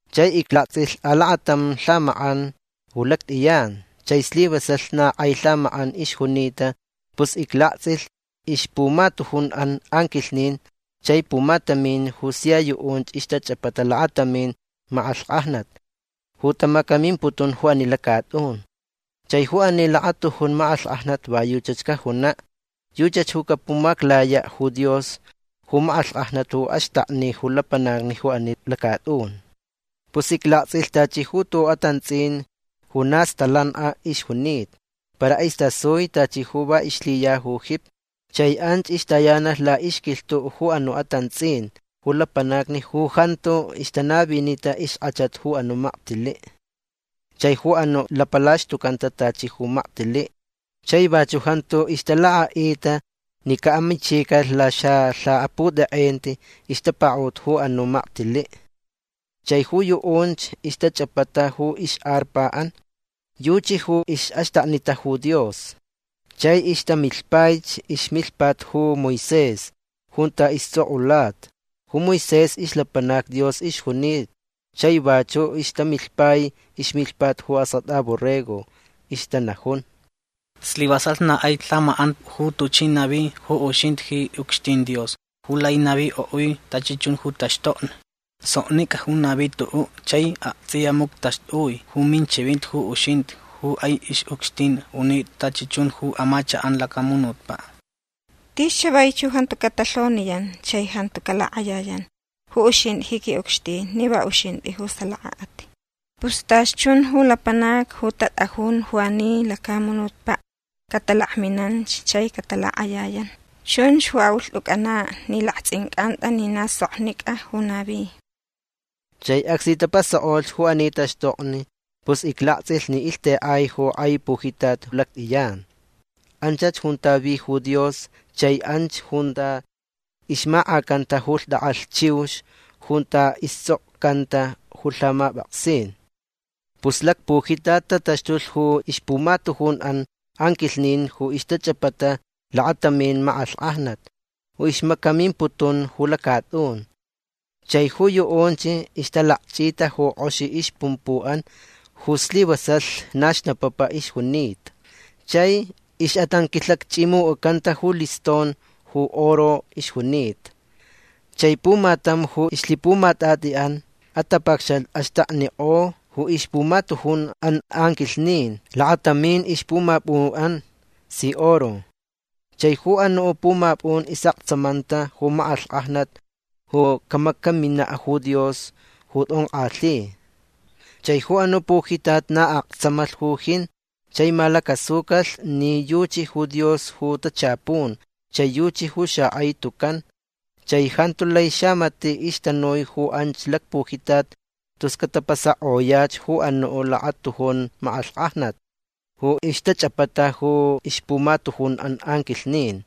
Chai iclaktsʼilh alakatam lhamakʼan ju lactʼiyan. Chai slivasalh na kʼai lhamakʼan ixjunita. Pus iclaktsʼilh ixpumatujunʼan anquilhnin chai pumatamin ju sia yuʼunch ixtachʼapata lakatamin makʼalhkʼajnat ju tamacamimputun ju ani lacatʼun. Chai ju ani lakatujun makʼalhkʼajnat va yuchach cajunaʼ. Yuchach ju capumaclayaʼ ju Dios ju makʼalhkʼajnat ju axtakni ju lapanacni ju ani lacatʼun. Pus iclaktsʼilh tachi tuʼuʼ atantsʼin ju na stalankʼa ixjunita. Para istasui tachi ju va ixlhiya ju jipi. Chai anch ixtayanalh laʼixquilhtuʼ ju anuʼ atantsʼin ju lapanacni ju jantu ixtanavinita ixkʼachat ju anuʼ maktiliʼ chai ju anuʼ lapalaxtucanta tachi ju maktiliʼ. Chai vachuʼ jantu ixtalakʼaʼita ni caʼamichicalh laxalhaputʼekʼenti ixtapakaʼut ju anuʼ maktiliʼ. Chai ju yuʼunch ixtachʼapata ju ixʼarpaʼan. Yuchi ju ixʼaxtaknita ju Dios. Chai ixtamilhpaich ixmilhpat ju Moisés junta istsʼokʼulata. Ju Moisés ixlapanac Dios ixjunita. Chai vachuʼ ixtamilhpai ixmilhpat ju Askʼatʼa Borrego. Ixtanajun: Slivasalh na kʼai lhamakʼan ju tuchʼi navi ju uxintʼi ji ucxtin Dios ju lai navikʼoʼui tachi chun ju taxtokni. Soknicʼa ju navi tuʼuʼ chai aktsʼiya muctʼaxtʼui ju minchivinti ju uxintʼi ju kʼai ixʼucxtin unitʼa tachi chun ju amachakʼan lacamunutpaʼ. Tis chavaich ju jantu catalhoniyan chai jantu calakʼayayan ju uxintʼi ji ucxtin ni va uxintʼi ju salakaʼat. Pus tachi chun ju lapanacni ju tatʼajun ju ani lacamunutpaʼ catalakminanch chai catalakʼayayan. Chunch ju aʼulhtʼucʼanaʼ ni laktsʼincʼantʼa ni na soknicʼa ju navi. Chai acsni tapasakʼo ju ani taxtokni pus iclaktsʼilh ni ilhtekʼai ju kʼai pujitat lactʼiyan. Anchach junta vi ju Dios chai anch junta ixmakʼacanta ju lhtʼakʼalh chiux junta istsʼokcanta ju lhamapʼaksin. Pus lacpujitat tataxtulh ju ixpumatujunʼan anquilhnin ju ixtachʼapata lakatamin makʼalhkʼajnat ju ixmacamimputun ju lacatʼun. Chai ju yuʼunch ixtalakchʼita ju kʼoxi ixpumpuʼan ju slivasalh na xnapapa ixjunita. Chai ixʼatanquilhakchʼimucʼacanta ju liston ju oro ixjunita. Chai pumatam ju ixlhipumatʼatʼiʼan atapacxat axtaknikʼo ju ixpumatujunʼan anquilhnin lakatamin ixpumapʼunʼan si oro. Chai ju anuʼ pumapʼun isʼaktsamanta ju makʼalhkʼajnat ju camacaminaʼ ju Dios ju tʼonkʼalhi. Chai ju anuʼ pujitat na aktsamalh ju jin chai malacasucalh ni yuchi ju Dios ju tachapun chai yuchi ju xakʼai tucan. Chai jantu lai xamatiʼ ixtanui ju anch lacpujitat tus catapasakʼoyach ju anuʼ lakatujun makʼalhkʼajnat ju ixtachʼapata ju ixpumatujunʼan anquilhnin.